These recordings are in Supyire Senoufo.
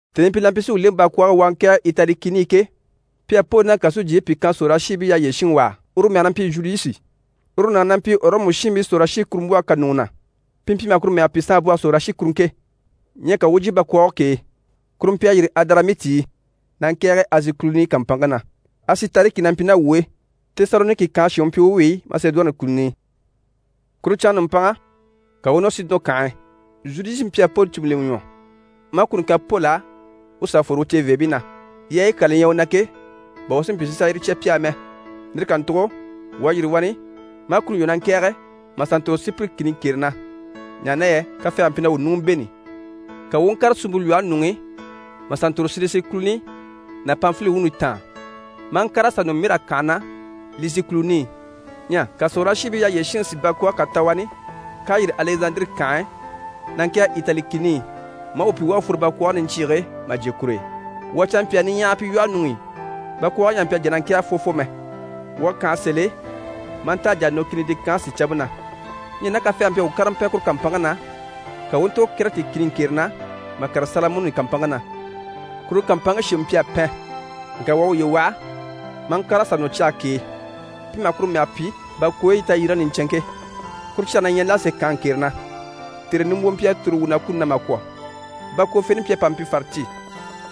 Tèni i pi la mpyi si wuu lèŋɛ bakwɔɔge e wuu a ŋkɛ̀ɛge Itali kìni i ke, pi à Poli ná kàsujyiibii pìi kan sòrolashiibii yyaha yyére shinŋi wà á, uru mɛge na mpyi Zhuliyusi. Uru nàŋi na mpyi Ɔrɔmu shiinbii sòrolashikurumbwɔhe kà ɲùŋɔ na, pi mpyi maha kuru mɛge pyi: «Saanbwɔhe Sorolashikuruŋke.» Ɲyɛ ka wuu u jyè bakwɔɔge k'e, kuru mpyi a yîri Adaramiti i na ŋkɛ̀ɛge Azi kùluni kàmpanŋke na. Asitariki na mpyi ná wuu e. Tesaloniki kànhe shin u mpyi u wi, Masedoni kùluni i. Kuru canŋa nùmpanŋa, ka wuu u nɔ Sidɔn kànhe e. Zhuliyusi mpyi a Poli cùmu lemɛ ɲwɔ, maa kuni kan Poli á u sà fworo u ceveebii na, yaayi kyaa li ɲyɛ u na ke, bà u si mpyi si sà yire cya pi á mɛ. Lire kàntugo wuu à yîri wani maa kuni lwɔ́ na ŋkɛ̀ɛge mà sà ntòro Sipiri kìni ŋkere na, ɲaha na yɛ kafɛɛge mpyi na wuu ɲùŋɔ bêni. Ka wuu u ŋkàre suumpe lwɔhe ɲuŋ'i mà sà ntòro Silisi kùluni ná Panfili wuuni taan, maa ŋkàre mà sà nɔ Mira kànhe na Lisi kùluni i. Ɲyɛ ka sòrolashiibii yyaha yyére shinŋi si bakwɔɔge kà ta wani k'à yîri Alɛzandire kànhe e na ŋkɛ̀ɛge Itali kìni i, maa wuu pyi wuu à fworo bakwɔɔge niɲcyiige e mà jyè kur'e. Wuu à canmpyaa niɲyahagii pyi lwɔhe ɲuŋ'i. Bakwɔɔge ɲyɛ a mpyi a jà na ŋkɛ̀ɛge fwɔfwɔ mɛ. Wuu à kànha sèl'e maa nta a jà a nɔ Kinidi kànhe sìcampe na. Ɲyɛ ná kafɛɛge mpyi a wuu kárama pɛn kuru kàmpanŋke na, ka wuu u ntòro Kɛrɛti kìni ŋkere na, mà kàre Salamɔni kàmpanŋke na. Kuru kàmpanŋke shemɛ mpyi a pɛn, ŋka wuu à wuye waha maa ŋkàre mà sà nɔ cyage k'e, pi maha kuru mɛge pyi: «Bakwooyi Tayyerege Niɲcɛnŋke». Kuru cyage na ɲyɛ Lase kànhe ŋkere na. Tère nimbwoo mpyi a tòro wuu na kuni na mà kwɔ̀. Bakwofeni mpyi a pa mpyi farati,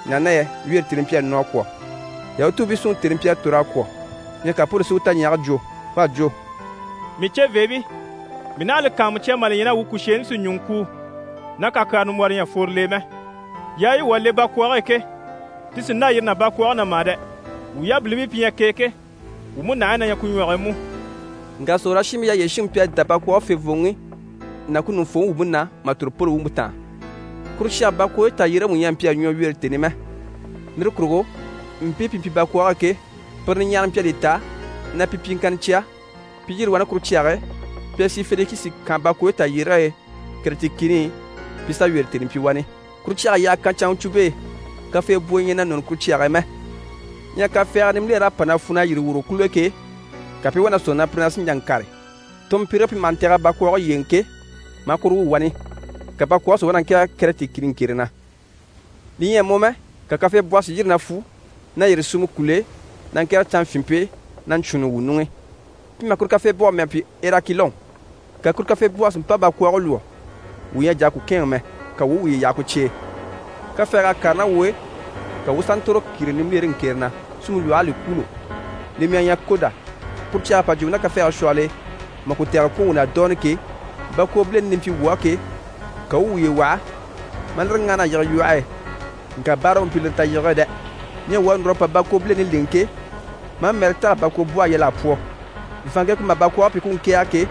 ɲaha na yɛ wyeere tèni mpyi a nɔ a kwɔ̀, Yahutuubii súnŋi tèni mpyi a tòr'a kwɔ̀. Ɲyɛ ka Poli si u taɲyage jwo. U à jwo: «Mii ceveebii, mii naha a li kàanmucya mà li ɲya na wuu kùsheeni sì ɲùŋɔ kuu ná kakyara nimbwɔrɔ ɲyɛ a fworo l'e mɛ. Yaayi wuu à le bakwɔɔge e ke, ti sì n‑dâ yire ná bakwɔɔge na mà dɛ! Wuu yabilimpii pi ɲyɛ k'e ke, wuu múnahigii na ɲyɛ ku ɲwɔge e mú.» Ŋka sòrolashiibii yyaha yyére shinŋi mpyi a dá bakwɔɔge fèvooŋi ná ku ɲùŋufooŋi wumpe na mà tòro Poli wumpe táan. Kuru cyage bakwooyi tayyérege mú ɲyɛ a mpyi a ɲwɔ wyeere tèni i mɛ. Lire kurugo mpii pi mpyi bakwɔɔge e ke, pire niɲyahara mpyi a li ta na pi pyiŋkanna cya pi i yîri wani kuru cyage e, pi a sì Fenikisi kànhe bakwooyi tayyérege e Kɛrɛti kìni i, pi i sà wyeere tèni pyi wani. Kuru cyag'à yyaha kan canŋacwumpe e. Kafeebwoyi ɲyɛ na nɔni kuru cyage na mɛ. Ɲyɛ kafɛɛgɛ nimbiler'à pa na fwu na yîri wòro kùl'e ke, ka pi i wá na sɔ̂nŋi na pire sí n‑jà n‑kàre. Tɔɔnmpirige pi maha ntɛ̀g'a bakwɔɔge yyéeŋɛ ke, maa kuru wwû wani, ka bakwɔɔge si wá na ŋkɛ̀ɛge Kɛrɛti kìni ŋkere na. Li ɲyɛ a mɔ mɛ, ka kafeebwɔhɔ si yîri na fwu na yîri suumɔ kùl'e na ŋkɛ̀ɛge canŋafyinmpe e na ɲcwûunni wuu ɲuŋ'i. Pi maha kuru kafeebwɔhɔ mɛge pyi: «Erakilɔn». Ka kuru kafeebwɔhe si mpa bakwɔɔge lwɔ́. Wuu ɲyɛ a jà a ku kɛ̂ɛnŋɛ mɛ, ka wuu u wuye yaha ku cye e. Kafɛɛg'à kàre ná wuu e, ka wuu u sà ntòro kìre nimbilere ŋkere na, suumpe lwɔh'à li kwûulo, li mɛge ɲyɛ Koda. Kuru cyag'à pa jyè wuu ná kafɛɛge shwɔhɔl'e maa ku tɛgɛlɛ kwɔ̀n wuu na dooni ke, bakwobileni li mpyi wuu á ke, ka wuu u wuye waha maa lire ŋáhana a yige lwɔhe e, ŋka báara u mpyi lire tayigege e dɛ! Ɲyɛ wuu à núr'a pa bakwobileni lèŋɛ ke, maa mɛɛrɛ tɛ̀g'a bakwobwɔhe yal'a pwɔ. Vàanŋke ku maha bakwɔɔge pyi ku u ŋkɛ̀ɛge ke,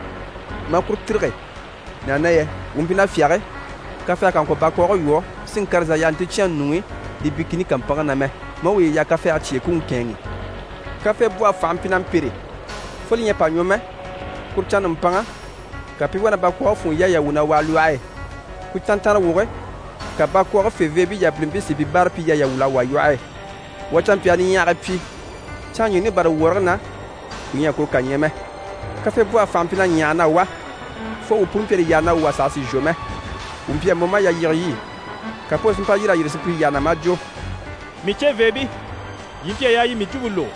maa kuru tîrige, ɲaha na yɛ wuu mpyi na fyáge kafɛɛge kà ŋkwɔ̀ bakwɔɔge lwɔ́ si ŋkàre zà yaha nticyɛnŋi ɲuŋ'i Libi kìni kàmpanŋke na mɛ, maa wuye yaha kafɛɛge cye e ku u ŋkɛ̂ɛnŋi. Kafeebwɔhe fànha mpyi na mpêre fo li ɲyɛ a pa ɲwɔ mɛ, kuru canŋa nùmpanŋa, ka pi i wá na bakwɔɔge funŋɔ yaayi yà wwû na wàa lwɔhe e. Ku canntanrewoge, ka bakwɔɔge feveebii yabilimpii si pi báarapyiyaayi yà wwûl'a wà lwɔhe e. Wuu à canmpyaa niɲyahagii pyi, canŋaɲyiini bâra wɔrigii na, wuu ɲyɛ a kuru kà ɲya mɛ. Kafeebwɔhe fànhe mpyi na ɲyahage na wá, fo wuu puni mpyi a li yaha na wuu wà saha sì n‑shwɔ mɛ. Wuu mpyi a mɔ maa yalyige lyî. Ka Poli si mpa yîr'a yyére sùpyire yyaha na, maa jwo: «Mii ceveebii, yii mpyi a yaa yii i mii jwumpe lógo,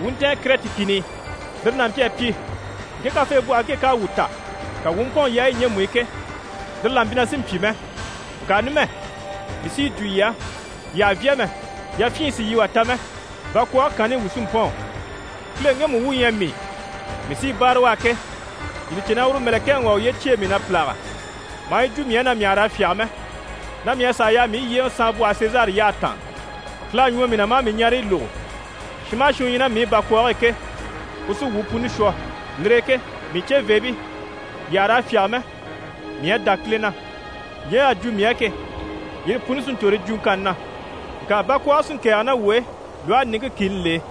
wuu u ntɛ̀ɛn Kɛrɛti kìni i. Lire n'a mpyi a pyi, ŋke kafeebwɔhe ku ŋke k'à wuu ta, ka wuu u mpɔ̂ɔn yaayi ɲjemu i ke, lire là mpyi na sì n‑pyi mɛ. Ŋka numɛ, mii sí yi jwo yii á, yii àha vyá mɛ, yafyin sì yii wà ta mɛ. Bakwɔɔge kanni i wuu sí n‑pɔ̂ɔn. Kileŋi ŋgemu wu u ɲyɛ mii, mii sí i báare u á ke, yii li cè na uru mɛ̀lɛkɛŋi wà à uye cyêe mii na pìlaga, maa yi jwo mii á na mii àha raa fyáge mɛ, na mii à sàa yaa mii yyéeŋɛ saanmbwɔhe Sezari yyahe taan. Kile à ɲwɔ mii na maa mii ɲareyi lógo. Shin maha shin u ɲyɛ ná mii i bakwɔɔge e ke, u sí wuu puni shwɔ. Lire e ke mii ceveebii, yii àha raa fyáge mɛ. Mii à dá Kile na. Ɲje y'à jwo mii á ke, yire puni sí n‑tòro yi jwuŋkanni na. Ŋka bakwɔɔge sí n‑kɛ̀ɛge ná wuu e lwɔhe niŋke kìni l'e.»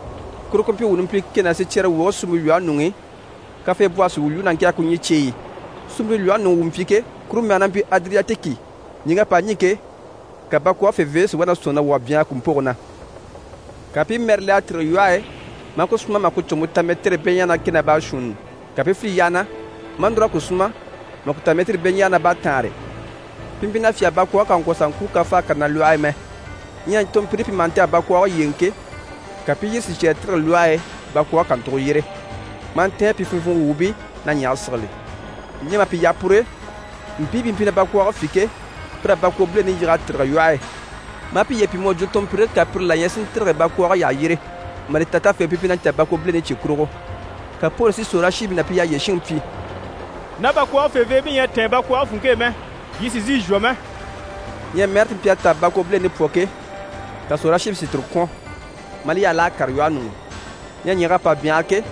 Kuru ku mpyi wuu numpili kɛ ná sicyɛrewoge suumpe lwɔhe ɲuŋ'i, kafeebwɔhe sí i wuu lwúu na ŋkɛ̀ɛge ku ɲyii cyeyi i. Suumpe lwɔhe ɲuŋ'i wuu mpyi ke, kuru mɛge na mpyi Adiriyatiki. Ɲìŋk'à pa ɲî ke, ka bakwɔɔge feveebii si wá na sɔ̂nŋi na wuu à byanhara kùmpoge na. Ka pi i mɛɛrɛ le a tîrige lwɔhe e maa ku súma mà ku cùgumpe ta mɛtirii beɲaaga ná kɛ ná baashuunni. Ka pi i file yyaha na, maa núr'a ku súma mà ku ta mɛtirii beɲaaga ná baataanre. Pi mpyi na fyáge bakwɔɔge kà ŋkwɔ̀ zà ŋkúu kafaage kà na lwɔhe e mɛ. Ɲyɛ tɔɔnmpiriyi pi maha ntɛ̀g'a bakwɔɔge yyéeŋɛ ke, ka pi i yire sicyɛɛre tîrige lwɔhe e bakwɔɔge kàntugo yyére, maa ntɛ̀ɛn pi funvwugo wuubii na ɲyɛ̀ge sigili. Ɲyɛ mà pi yaha pur'e, mpii pi mpyi na bakwɔɔge fî ke, pir'à bakwobileni yig'a tîrige lwɔhe e, maa piye pyi mu à jwo tɔɔnmpirige kà pire la ɲyɛ si ntîrige bakwɔɔge yyaha yyére, mà li ta tafeŋɛ pi mpyi na ɲcaa bakwobileni cye kurugo. Ka Poli si sòrolashiibii ná pi yyaha yyére shinŋi pyi: «Ná bakwɔɔge feveebii ɲyɛ a tɛ̀ɛn bakwɔɔge funŋke e mɛ, yii sì n‑sìi n‑shwɔ mɛ.» Ɲyɛ mɛɛre ti mpyi a tɛ̀g'a bakwobileni pwɔ ke, ka sòrolashiibii si tire kwɔ̀n, maa li yaha l'à kàre lwɔhe ɲuŋ'i. Ɲyɛ ɲyɛ̀g'à pa byanhara ke,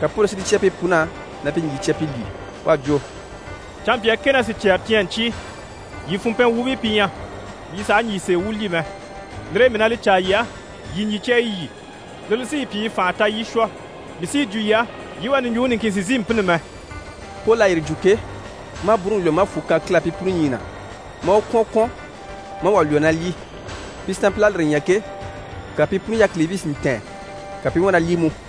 ka Poli si li cya pi pun'á na pi ɲjyì cya pi lyî. U à jwo: «Canmpyaa kɛ ná sicyɛɛre cyi ɲyɛ ɲcyii, yii funmpɛn wuubii pi ɲyɛ, yii sàha ɲjyì sèe wu lyî mɛ. Lire e mii na li caa yii á, yii ɲjyì cya yii lyî. Lire li sí yii pyi yii fànha ta yii i shwɔ. Mii sí yi jwo yii á, yii wà ɲùɲjuŋɔ niŋkin sì n‑sìi n‑pînni mɛ.» Poli à yire jwo ke, maa bwúuruŋi lwɔ́ maa fwù kan Kile á pi puni ɲyii na, maa u kwɔ̀n kwɔ̀n, maa wà lwɔ́ na lyî. Pi sanmpil'à lire ɲya ke, ka pi puni yákilibii si ntɛ̀ɛn, ka pi i wá na lyî mú.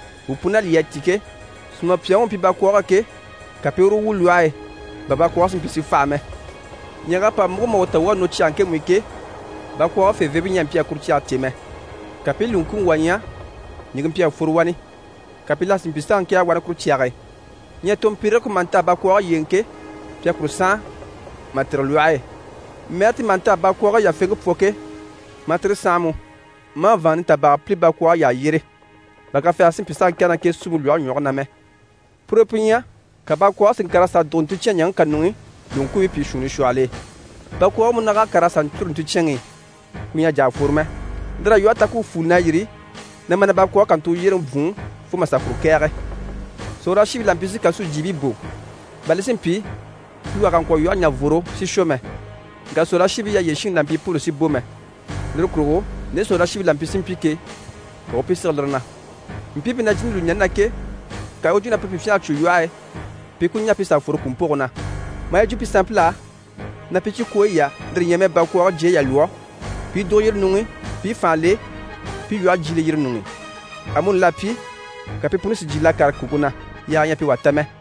Wuu pun'à lyî a tîn ke, sùmapyaŋi u mpyi bakwɔɔge e ke, ka pi i uru wu lwɔhe e, bà bakwɔɔge si mpyi si faha mɛ. Ɲyɛ̀g'à pa múgo mà wuu ta wuu à nɔ cyage ŋkemu i ke, bakwɔɔge feveebii ɲyɛ a mpyi a kuru cyage cè mɛ. Ka pi i lùŋkuuŋi wà ɲya, ɲìŋke mpyi a fworo wani, ka pi la si mpyi s'a ŋkɛ̀ɛge wani kuru cyage e. Ɲyɛ tɔɔnmpirige ku maha ntɛ̀g'a bakwɔɔge yyéeŋɛ ke, pi à kuru sànha mà tîrige lwɔhe e, mɛɛre ti maha ntɛ̀g'a bakwɔɔge yafeŋke pwɔ ke, maa tire sànha mú, maa vàanŋa nitabaaga pìli bakwɔɔge yyaha yyére, bà kafɛɛge si mpyi s'a ŋkɛ̀ɛge ná k'e suumpe lwɔhe ɲwɔge na mɛ. Pur'e pi ɲyɛ, ka bakwɔɔge si ŋkàr'a sà dùgo nticyɛn ɲaŋke kà ɲuŋ'i, lùŋkuubii pìi shuunni shwɔhɔl'e. Bakwɔɔge munag'à kàr'a sà ɲcûru nticyɛnŋi i, ku ɲyɛ a jà a fworo mɛ. Lir'à lwɔhe ta ku u fuuli na yîri na ma na bakwɔɔge kàntugo yyéreŋi bwùun, fo mà sà kuru kɛ̀ɛge. Sòrolashiibii la mpyi si kàsujyiibii bò, bà li si mpyi pi wà kà ŋkwɔ̀ lwɔhe ɲà vworo si shwɔ mɛ. Ŋka sòrolashiibii yyaha yyére shinŋi la mpyi Poli sì bò mɛ. Lire kurugo nde sòrolashiibii la mpyi si mpyi ke, ka u u pi sige lire na. Mpii pi na jìni lùɲani na ke, ka u u jwo na pire pi fyânha a cwo lwɔhe e, pi i ku ɲà pi sà fworo kùmpoge na. Maa yi jwo pi sanmpil'á na pi cikwooyi yà, lire ɲyɛ mɛ bakwɔɔge jyayi yà lwɔ́ pi i dùgo yire ɲuŋ'i pi i fànha le, pi i lwɔhe jyiile yire ɲuŋ'i. Amuni l'à pyi, ka pi puni si jyiil'a kàre kùŋke na, yaaga ɲyɛ a pi wà ta mɛ.